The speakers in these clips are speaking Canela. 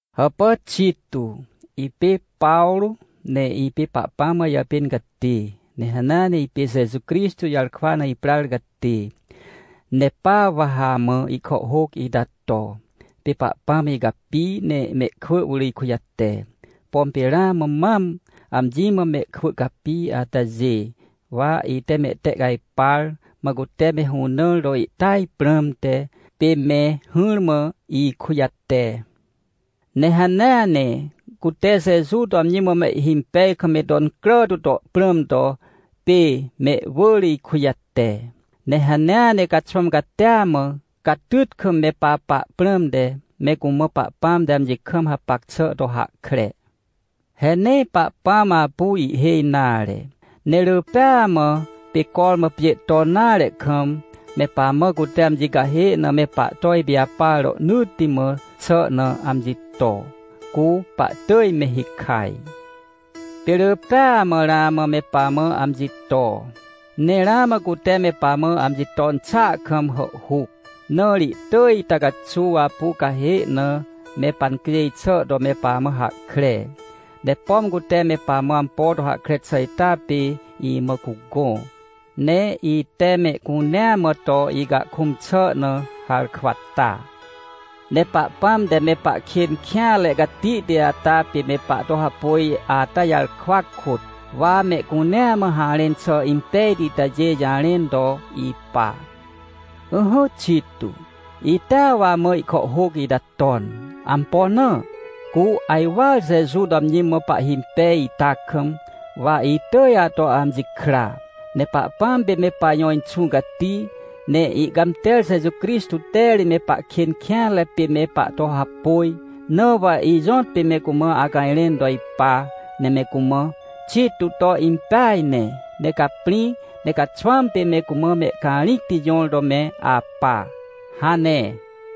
Hàpà Tito, ipê Pawrô, ne ipê Pahpãm mã ijàpên catê, ne hanea ne ipê Jeju Crixtô jarkwa na iprar catê, ne pa wa ha amã ihkàhhôc ita to. Pê Pahpãm icapi, ne mehkwỳ wỳr ikujate. Pom pê ramã mam amji mã mehkwỳ capi atajê, wa ite mehtehcajpar, mã cute me hũnãr to ihtỳaj prãmte, pê me hỹrmã ikujate. Ne hanea ne cute Jeju to amji mã mehhimpej kam me to incrà tu to prãm to pê mehwỳr ikujate. Ne hanea ne caxwãm catia mã, catyt kam me papa prãmte, me cumã Pahpãm te amji kam hapac xà to hahkre. He nee Pahpãm apu ihhêj nare, ne rỳ pêa mã, pê cormã pjê ton nare kam, me pamã cute amji cahê na me pahto ipijapar rohnỳtti mã xà na amji to, cu pahtỳj me hikaj. Pê rỳ pêa mã ramã me pamã amji to. Ne ramã cute me pamã amji ton xàa kam hàhhuc, na ri ihtỳj ita caxuw apu cahê na me pancjêj xà to me pamã hahkre. Ne pom cute me pamã ampo to hahkre xà ita pê imã cugõ, ne ite mehcunea mã to icahkũm xà na harkwa ta. Ne Pahpãm te me pahkên kêanre catihti ata pê me pahto hapôj ata jarkwa kôt, wa mehcunea mã harẽn xà impejti itajê jarẽn to ipa. Ỹhỹ Tito, itea wa amã ihkàhhôc ita ton. Ampo na? Cu ajwar Jeju to amji mã pahhimpej ita kam, wa itỳj ato amji kra. Ne Pahpãm pê me pajõ Inxũ Cati, ne ihcãmter Jeju Crixtô te ri me pahkên kêanre pê me pahto hapôj, na wa ijõtpê me cumã acajrẽn to ipa, ne me cumã: — Tito to impeaj ne, ne caprĩ, ne caxwãm pê me cumã me acarĩcti jõr to me apa — hane.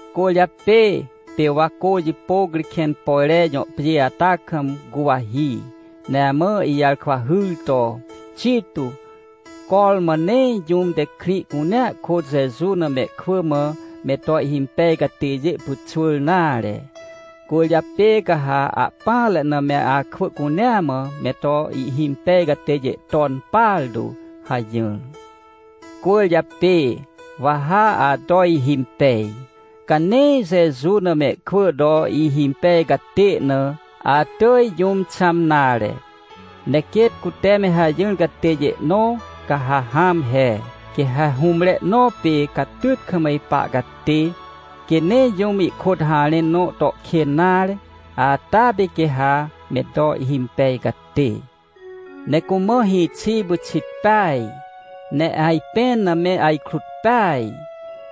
Cwỳrjapê pê wa cô jipôc ri, Kẽnpojre jõ pjê ata kam guwahi, ne amã ijarkwa hyr to: — Tito, cormã nee jũm te krĩ cunea kôt Jeju na mehkwỳ mã me to ihhimpej catêjê pyxwỳr nare. Cwỳrjapê ca ha ahpỹanre na me akwỳ cunea mã, me to ihhimpej catêjê ton partu — hajỹr. Cwỳrjapê wa ha ato ihimpej. Ca nee Jeju na mehkwỳ to ihhimpej catê na, atỳj jũm xãm nare. Ne quêt cute me hajỹr catêjê nõ, ca ha hãm he. Quê ha hũmre nõ pê catyt kam ipa catê, quê nee jũm ihkôt harẽn nõ to kên nare, ata pê quê ha me to ihhimpej catê. Ne cumã hĩxi pyxit peaj, ne ajpẽn na me ajkrut peaj.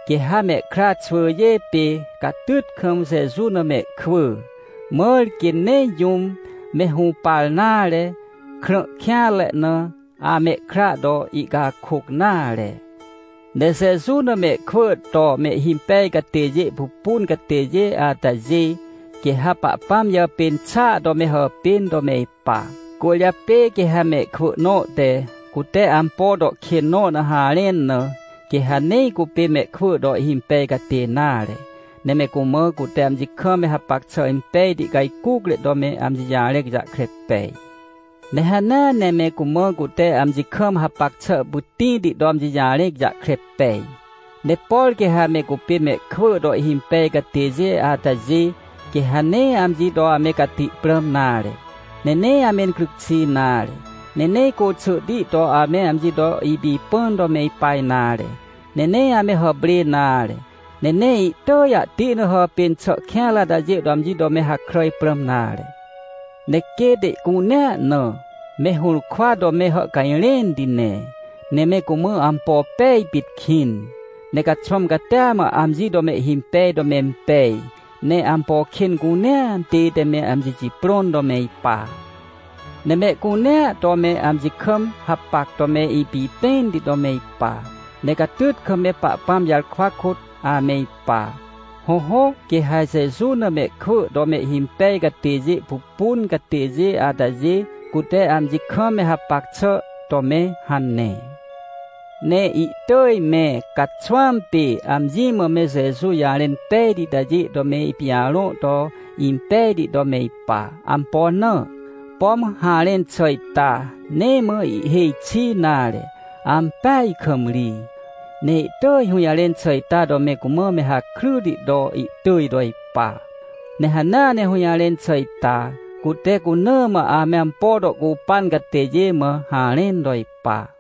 Quê ha mehkra xwỳjê pê catyt kam Jeju na mehkwỳ. Mãr quê nee jũm, me hũpar nare, krã kêanre na, amehkra to ihcakôc nare. Ne Jeju na mehkwỳ to mehhimpej catêjê pupun catêjê atajê, quê ha Pahpãm jàpên xàa to me hàpên to me ipa. Cwỳrjapê quê ha mehkwỳ nõ te, cute ampo to kên nõ na harẽn na, quê ha nee cupê mehkwỳ to ihhimpej catê nare. Ne me cumã, cute amji kam me hapac xà impejti cajcucre to me amji jarẽc jahkre pej. Ne hanea ne me cumã cute amji kam hapac xà pytĩti to amji jarẽc jahkre pej. Ne por quê ha me cupê mehkwỳ to ihhimpej catêjê atajê, quê ha nee amji to ame cati prãm nare, ne nee amencryc xi nare, ne nee côxỳhti to ame amji to ipipãn to me ipa nare, ne nee ame hàprê nare, ne nee ihtỳj ahti na hàpên xà kêanre atajê to amji to me hakràj prãm nare. Ne quêt ihcunea na, me hũrkwa to me hàhcajrẽnti ne, ne me cumã ampo pej pit kĩn. Ne caxwãm catia mã amji to mehhimpej to mempej, ne ampo kên cunea tête me amji jiprõn to me ipa. Ne mehcunea to me amji kam hapac to me ipipẽnti to me ipa. Ne catyt kam me Pahpãm jarkwa kôt ame ipa. Hõhõ, quê ha Jeju na mehkwỳ to mehhimpej catêjê pupun catêjê atajê cute amji kam me hapac xà to me hane. Ne ihtỳj me caxwãm pê amji mã me Jeju jarẽn pejti itajê to me ipijarõ to impejti to me ipa. Ampo na? Pom harẽn xà ita, nee mã ihhêj xi nare, ampeaj kam ri. Ne ihtỳj hũjarẽn xà ita to me cumã me hakryti to ihtỳj to ipa. Ne hanea ne hũjarẽn xà ita, cute cuna mã ame ampo to ihcupan catêjê mã harẽn to ipa.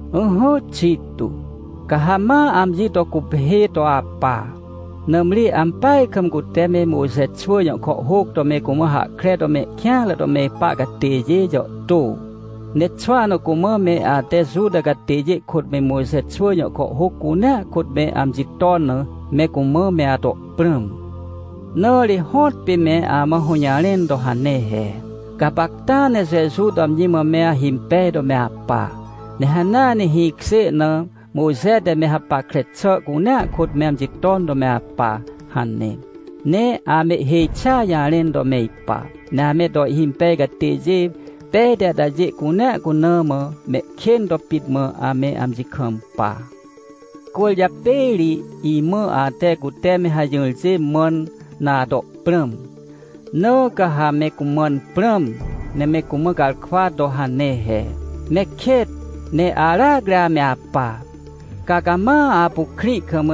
Ỹhỹ, Tito, ca ha ma amji to guphê to apa, nãmri ampeaj kam cute me Mojxe xwỳ jõ kàhhôc to me cumã hahkre to mehkêanre to me ipa catêjê jàhtô. Ne xwahna cumã me ate Juta catêjê kôt me Mojxe xwỳ jõ kàhhôc cunea kôt me amji ton na, me cumã me ato prãm. Na ri hõtpê me amã hũjarẽn to hane he: — Gapacta ne Jeju to amji mã me ahimpej to me apa, ne hanea ne hĩkjê na, Mojxe te me hapackre xà cunea kôt me amji ton to me apa — hane. Ne amehhêj xia jarẽn to me ipa. Ne ame to ihhimpej catêjê pejti atajê cunea cuna mã, mehkên to pit mã ame amji kampa. Cwỳrjapê ri imã ate cute me hajỹrjê mãn na ato prãm. Na ca ha me cumãn prãm, ne me cumã garkwa to hane he: — Me kêt! Ne aracri ame apa! Ca cama apu krĩ kam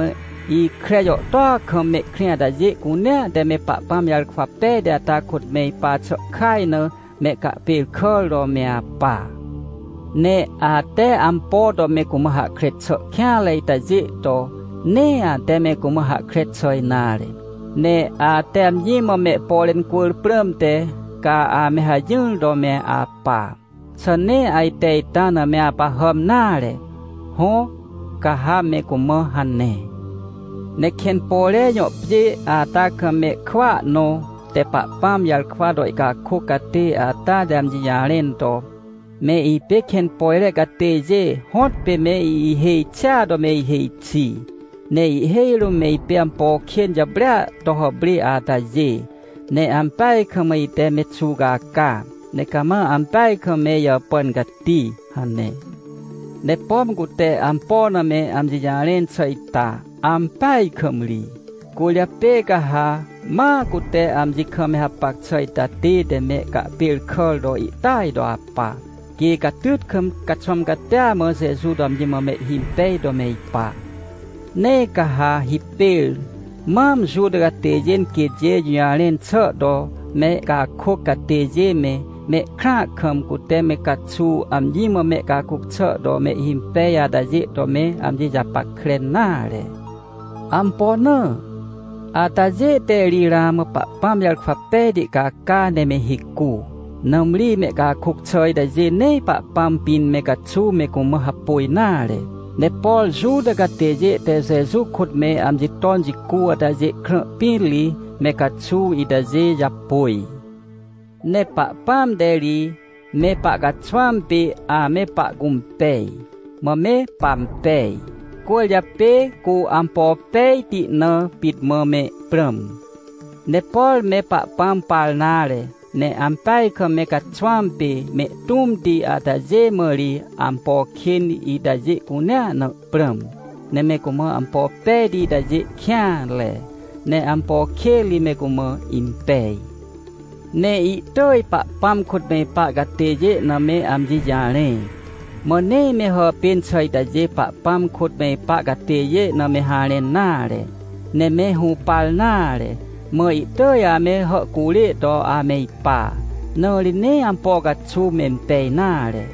ikre jàhtôa kam mehkrĩ atajê cunea te me Pahpãm jarkwa pejti ata kôt me ipa xà kaj na mehcahpêrkàr to me apa. Ne ate ampo to me cumã hahkre xà kêanre itajê to, nee ate me cumã hahkre xà nare. Ne ate amji mã mehpore incwỳr prãmte, ca ame hajỹr to me apa. Xà nee ajte ita na me apahàm nare? — Hõ, ca ha me cumã hane. Ne Kẽnpojre jõ pjê ata kam mehkwỳa nõ te Pahpãm jarkwa to ihcakôc catê ata te amji jarẽn to: — Me ipê Kẽnpojre catêjê hõtpê me ihêj xia to me ihêj xi, ne ihhêj rũm me ipê ampo kên jàprêa to hàprê atajê, ne ampeaj kam ite me xuwcaca, ne cama ampeaj kam me ijàpàn cati — hane. Ne pom cute ampo na me amji jarẽn xà ita, ampeaj kam ri. Cwỳrjapê ca ha ma cute amji kam me hapac xà ita tête me cahpêrkàr to ihtỳaj to apa, quê catyt kam caxwãm catia mã Jeju to amji mã mehhimpej to me ipa. Nee ca ha hipêr mam Juta catêjê quêtjê jũjarẽn xà to mehcakôc catêjê me, mehkrãa kam, cute me caxuw amji mã mehcakôc xà to mehhimpej atajê to me amji japackre nare. Ampo na? Atajê te ri ramã Pahpãm jarkwa pejti caca ne me hicu. Nãmri mehcakôc xà itajê nee Pahpãm pĩn me caxuw me cumã hapôj nare. Ne por Juta catêjê te Jeju kôt me amji ton jicu atajê krã pĩn ri me caxuw itajê japôj. Ne Pahpãm te ri me pahcaxwãm pê ame pahcũmpej, mã me pampej. Cwỳrjapê cu ampo pejti na pit mã me prãm. Ne por me Pahpãm par nare, ne ampeaj kam me caxwãm pê, mehtũmti atajê mã ri, ampo kên itajê cunea na prãm. Ne me cumã ampo pejti itajê ihkêanre, ne ampo kên ri me cumã impej. Ne ihtỳj Pahpãm kôt me ipa catêjê na me amji jarẽ. Mã nee me hàpên xà itajê Pahpãm kôt me ipa catêjê na me harẽn nare. Ne me hũpar nare, mã ihtỳj ame hàhcurê to ame ipa. Na ri nee ampo caxuw mempej nare.